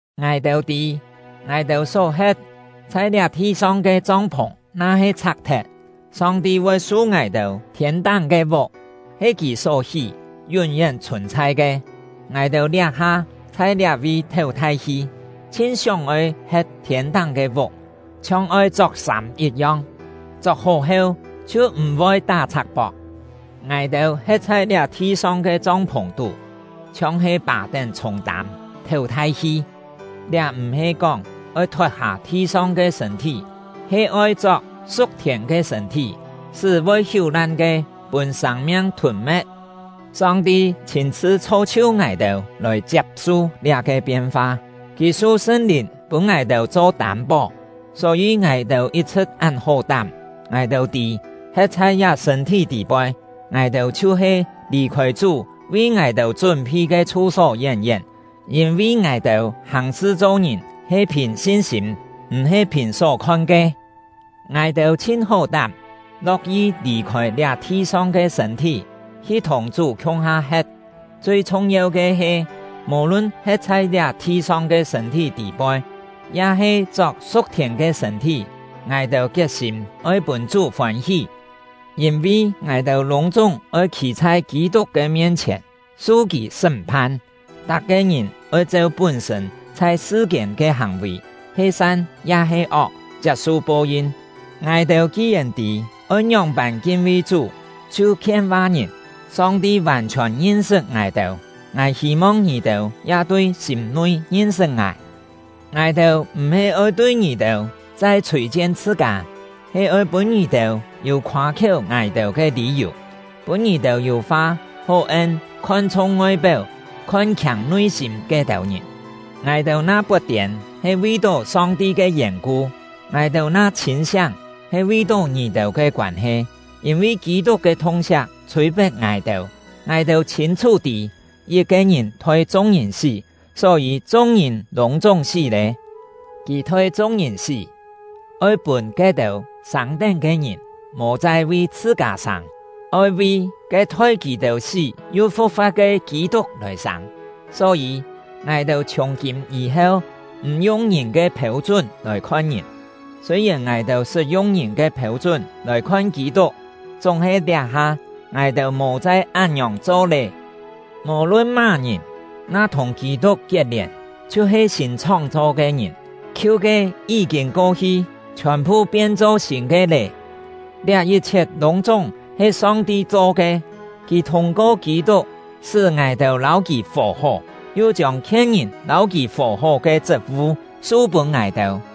Ngài-têu tî, ngài-têu só he̍t, chhai liá thi-song ke chong-phùng na-he chhak-thet, Song-ti voi su ngài-têu thiên-táng ke vuk, he Kì só hí, yún-yén chhùn-chhai ke. Ngài-têu liá-ha chhai liá-vi théu thai-hi, chhin sióng-oi he̍t thiên-táng ke vuk, chhiong oi chok-sâm yit-yong; chok-hó heu, chhiu m̀-voi tá-chhak-pok. Ngài-têu he̍t chhai liá thi-song ke chong-phùng-tú, chhiong-he pà-tén chhûng-tâm, théu thai-hi; liá m̀-he kóng oi thot-hâ thi-song ke sṳ̂n-thí, he oi chok su̍k-thiên ke sṳ̂n-thí, sṳ́ voi hiú-lan ke pûn sâng-miang thûn-me̍t. Song-ti chhîn-chhṳ chho-chhiu ngài-têu lòi chiap-su liá-ke pien-fa; Kì su Sṳn-Lìn pûn ngài-têu cho tâm-pó. Só-yî, ngài-têu yit-chhṳ̍t án hó-tám. Ngài-têu tî, he̍t chhai liá sṳ̂n-thí tî-poi, ngài-têu chhiu-he lì-khôi Chú vi ngài-têu chún-phi ke chhu-só yén-yén. Yîn-vi ngài-têu hàng-sṳ cho-ngìn he phìn sin-sîm, m̀-he phìn só khon ke. Ngài-têu chhin hó-tám, lo̍k-yi lì-khôi liá thi-song ke sṳ̂n-thí, hi thùng Chú khiung-ha he̍t. Chui chhung-yeu ke he, mò-lun he̍t chhai liá thi-song ke sṳ̂n-thí tî-poi, ya-he chok su̍k-thiên ke sṳ̂n-thí, ngài-têu kiet-sîm oi pûn Chú fôn-hí. Yîn-vi ngài-têu lûng-chúng oi khî chhai Kî-tuk ke mien-chhièn, su kì sṳ́m-phan. Tak-ke ngìn oi cheu pún-sṳ̂n chhai sṳ-kiên ke hàng-vì, he san ya-he ok, chiap-su po-yin. Ngài-têu ki-yèn tî oi ngióng-pân kin-vi Chú, chhiu khien-va ngìn. Song-ti vàn-chhiòn ngin-sṳt ngài-têu; ngài hî-mong ngì-têu ya tui sîm-nui ngin-sṳt ngài. Ngài-têu m̀-he oi tui ngì-têu chai chhûi-chien chhṳ-kâ, he oi pûn ngì-têu yû khoâ-khiéu ngài-têu ke lî-yù, pûn ngì-têu yû fa hó en khon-chhung ngoi-péu, khon-khiâng nui-sîm ke-têu ngìn. Ngài-têu na pot-tiên, he vi-tó Song-ti ke yèn-ku; ngài-têu na chhîn-siáng, he vi-tó ngì-têu ke koân-he. Yîn-vi Kî-tuk ke thung-siak chhûi-pet ngài-têu; ngài-têu chhîn-chhú tî, yit-ke ngìn thoi chung-ngìn sí, só-yî chung-ngìn lûng-chúng sí lé. Kì thoi chung-ngìn sí, oi pûn ke-têu sâng-tén ke ngìn mò chai vi chhṳ-kâ sâng, oi vi ke thoi kì-têu sí yu fu̍k-fa̍t ke Kî-tuk lòi sâng. Só-yî, ngài-têu chhiùng-kîm yî-heu m̀ yung ngìn ke phêu-chún lòi khon ngìn. Sûi-yèn ngài-têu sṳt yung ngìn ke phêu-chún lòi khon Kî-tuk, chúng-he liá-ha ngài-têu mò chai án-ngiòng cho lé. Mò-lun má-ngìn, na thùng Kî-tuk kiet-lièn, chhiu-he sîn chhóng-chho ke ngìn; khiu ke yí-kîn ko-hi, chhiòn-phu pien-cho sîn ke lé. Liá yit-chhiet lûng-chúng he Song-ti cho ke; Kì thûng-ko Kî-tuk sṳ́ ngài-têu lâu Kì fò-hó, yu chiông khien-ngìn lâu Kì fò-hó ke chṳt-vu su-pûn ngài-têu.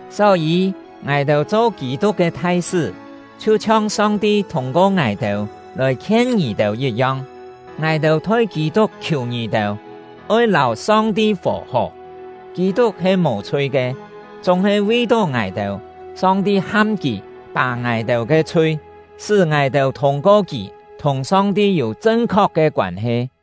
Só-yî, ngài-têu cho Kî-tuk ke thai-sṳ́, chhiu-chhiong Song-ti thûng-ko ngài-têu lòi khien ngì-têu yit-yong. Ngài-têu thoi Kî-tuk khiù ngì-têu: Oi lâu Song-ti fò-hó! Kî-tuk he mò-chhui ke, chúng-he vi-tó ngài-têu, Song-ti ham kì pà ngài-têu ke chhui, sṳ́ ngài-têu thûng-ko kì thùng Song-ti yû chṳn-khok ke koân-he.